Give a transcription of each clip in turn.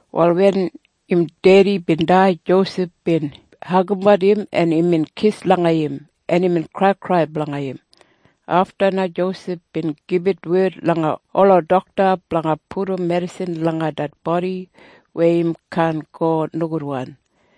Wal wen im dedi bin dai Josef bin hagambat im, en imbin kis langa im, en imbin kraikrai blanga im. Afta na Josef bin gibit wed langa ola dokta blanga pudum medisin langa det bodi weya im kaan go nogudwan.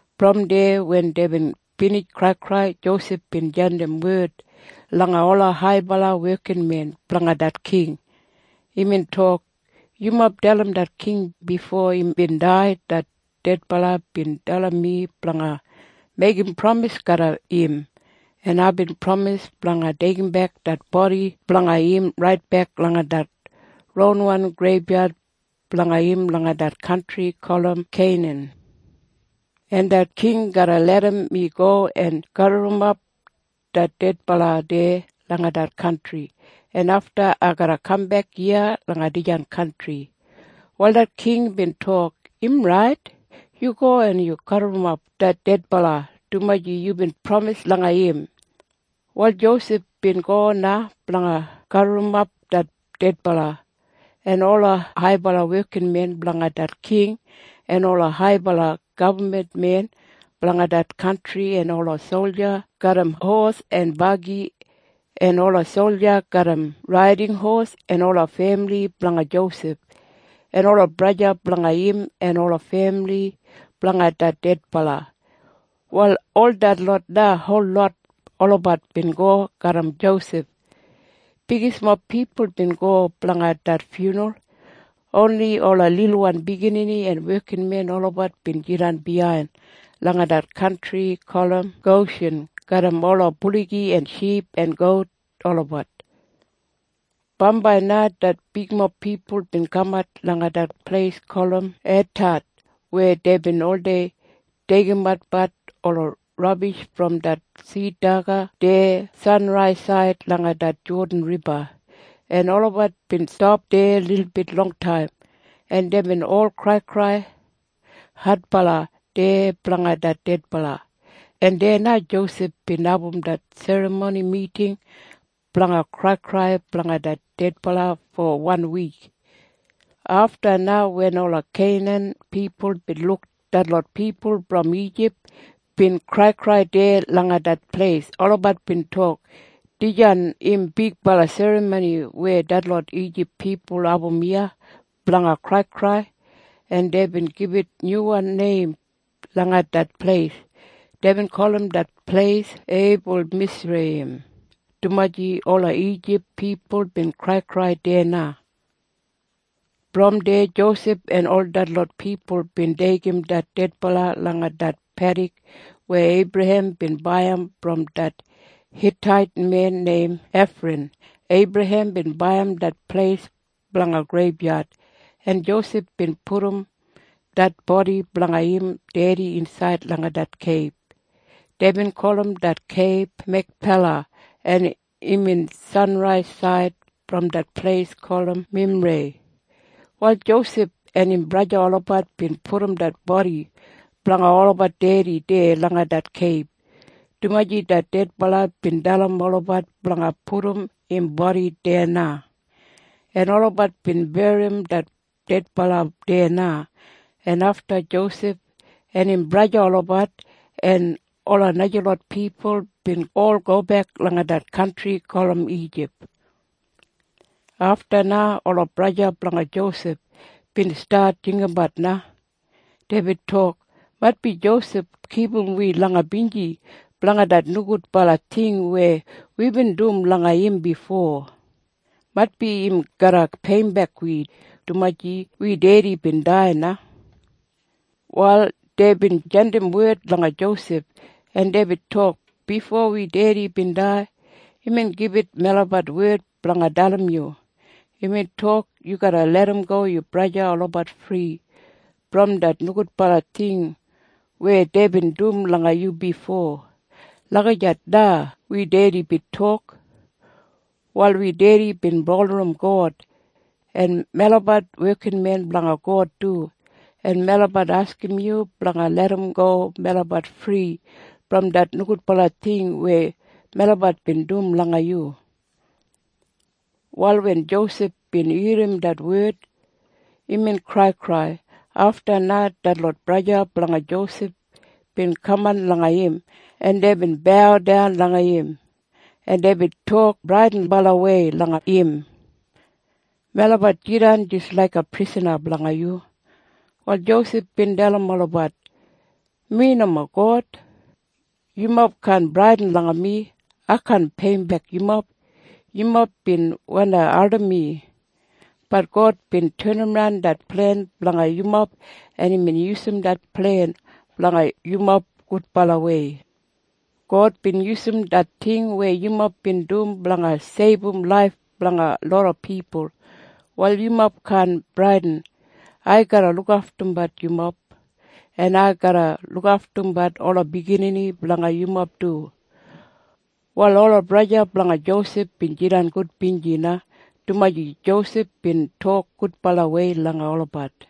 Brom deya wen deibin binij kraikrai, Josef bin jandim wed langa ola haibala wekinmen blanga det king. Imbin tok, “Yumob dalim det king, bifo imbin dai det dedbala bin dalim mi blanga meigim pramis garram im, en aibin pramis blanga deigimbek det bodi blanga im raitbek langa det ronwan greibyad blanga im langa det kantri gulum Keinan. En det king garra larram mi go en gaburrumap det dedbala deya langa det kantri, en afta ai garra kambek iya langa dijan kantri.” Wal det king bin tok, “Im rait. Yu go en gaburrumap det dedbala, dumaji yubin pramis langa im.” Wal Josef bin go na blanga gaburrumap det dedbala. En ola haibala wekinmen blanga det king en ola haibala gabman men blanga det kantri en ola solja garram hos en bagi en ola solja garram raiding hos en ola femili blanga Josef en ola braja blanga im en ola femili blanga det dedbala, wal ol detlot na holot olabat bin go garram Josef. Bigismob pipul bin go blanga det fyunral. Oni ola lilwan biginini en wekinmen olabat bin jidan biyain langa det kantri gulum Goshin garram ola buligi en ship en gout olabat. Bambai na det bigmob pipul bin kamat langa det pleis gulum Etad weya deibin oldei deigimatbat ola rabish brom det sid daga deya sanraisaid langa det Jodan Riba, en olabat bin stap deya lilbit longtaim. En deibin ol kraikrai adbala deya blanga det dedbala, en deya na Josef bin abum det serramoni miting blanga kraikrai blanga det dedbala fo wan wik. Afta na wen ola Keinan pipul bin luk detlot pipul brom Ijip bin kraikrai deya langa det pleis, olabat bin tok, “Dijan im bigbala serramoni weya detlot Ijip pipul abum iya blanga kraikrai.” En deibin gibit nyuwan neim langa det pleis. Deibin gulum det pleis Eibulmisreiyim, dumaji ola Ijip pipul bin kraikrai deya na. Brom deya Josef en ol detlot pipul bin deigim det dedbala langa det pedik weya Eibrahem bin baiyim brom det Hitait men neim Efran. Eibrahem bin baiyim det pleis blanga greibyad. En Josef bin pudum det bodi blanga im dedi insaid langa det keib. Deibin gulum det keib Mekpela, en imbin sanraisaid brom det pleis gulum Memrei. Wal Josef en im braja olabat bin pudum det bodi blanga olabat dedi deya langa det keib, dumaji det dedbala bin dalim olabat blanga pudum im bodi deya na. En olabat bin berrim det dedbala deya na, en afta Josef en im braja olabat en ola najalot pipul bin ol gobek langa det kantri gulum Ijip. Afta na ola braja blanga Josef bin stat jinggabat na. Deibin tok, “Maitbi Josef kipum wi langa binji blanga det nogudbala ting weya wibin dum langa im bifo. Maitbi im garra peiyimbek wi, dumaji wi dedi bin dai na.” Wal deibin jandim wed langa Josef, en deibin tok, “Bifo wi dedi bin dai, imbin gibit melabat wed blanga dalim yu. Imbin tok, ‘Yu garra larramgo yu braja olabat fri brom det nogudbala ting weya deibin dum langa yu bifo.’ Lagijat na wi dedi bin tok. Wal wi dedi bin bulurrum God. En melabat wekinmen blanga God du. En melabat askim yu blanga larramgo melabat fri brom det nogudbala ting weya melabat bin dum langa yu.” Wal wen Josef bin irrim det wed, imbin kraikrai. Afta na detlot braja blanga Josef bin kaman langa im, en deibin baudan langa im, en deibin tok bradinbalawei langa im, “Melabat jidan jis laiga prisana blanga yu.” Wal Josef bin dalim olabat, “Mi nomo God. Yumob kaan bradin langa mi. Ai kaan peiyimbek yumob. Yumob bin wandi ardim mi. Bat God bin tenimran det plen blanga yumob, en imbin yusum det plen blanga yumob gudbalawei. God bin yusum det ting weya yumob bin dum blanga seibum laif blanga loda pipul. Wal yumob kaan bradin. Ai garra lukaftumbat yumob, en ai garra lukaftumbat ola biginini blanga yumob du.” Wal ola braja blanga Josef bin jidan gudbinji na, dumaji Josef bin tok gudbalawei langa olabat.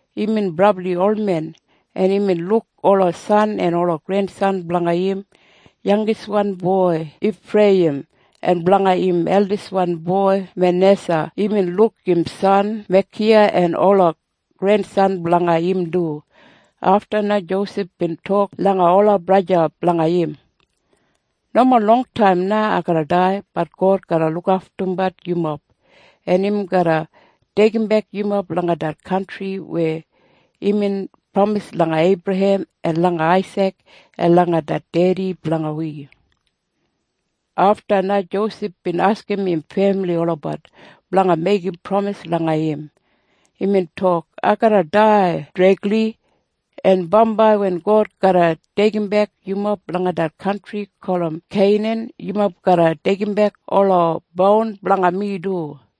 Imbin brabli olmen, en imbin luk ola san en ola grensan blanga im yangiswan boi Ifreiyim. En blanga im eldiswan boi Manesa imbin luk im san Mekiya en ola grensan blanga im du. Afta na Josef bin tok langa ola braja blanga im, “Nomo longtaim na ai garra dai. Bat God garra lukaftumbat yumob, en im garra deigimbek yumob langa det kantri weya imbin pramis langa Eibrahem en langa Aisik en langa det dedi blanga wi.” Afta na Josef bin askim im femili olabat blanga meigim pramis langa im. Imbin tok, “Ai garra dai dregli. En bambai wen God garra deigimbek yumob langa det kantri gulum Keinan, yumob garra deigimbek ola boun blanga mi du.”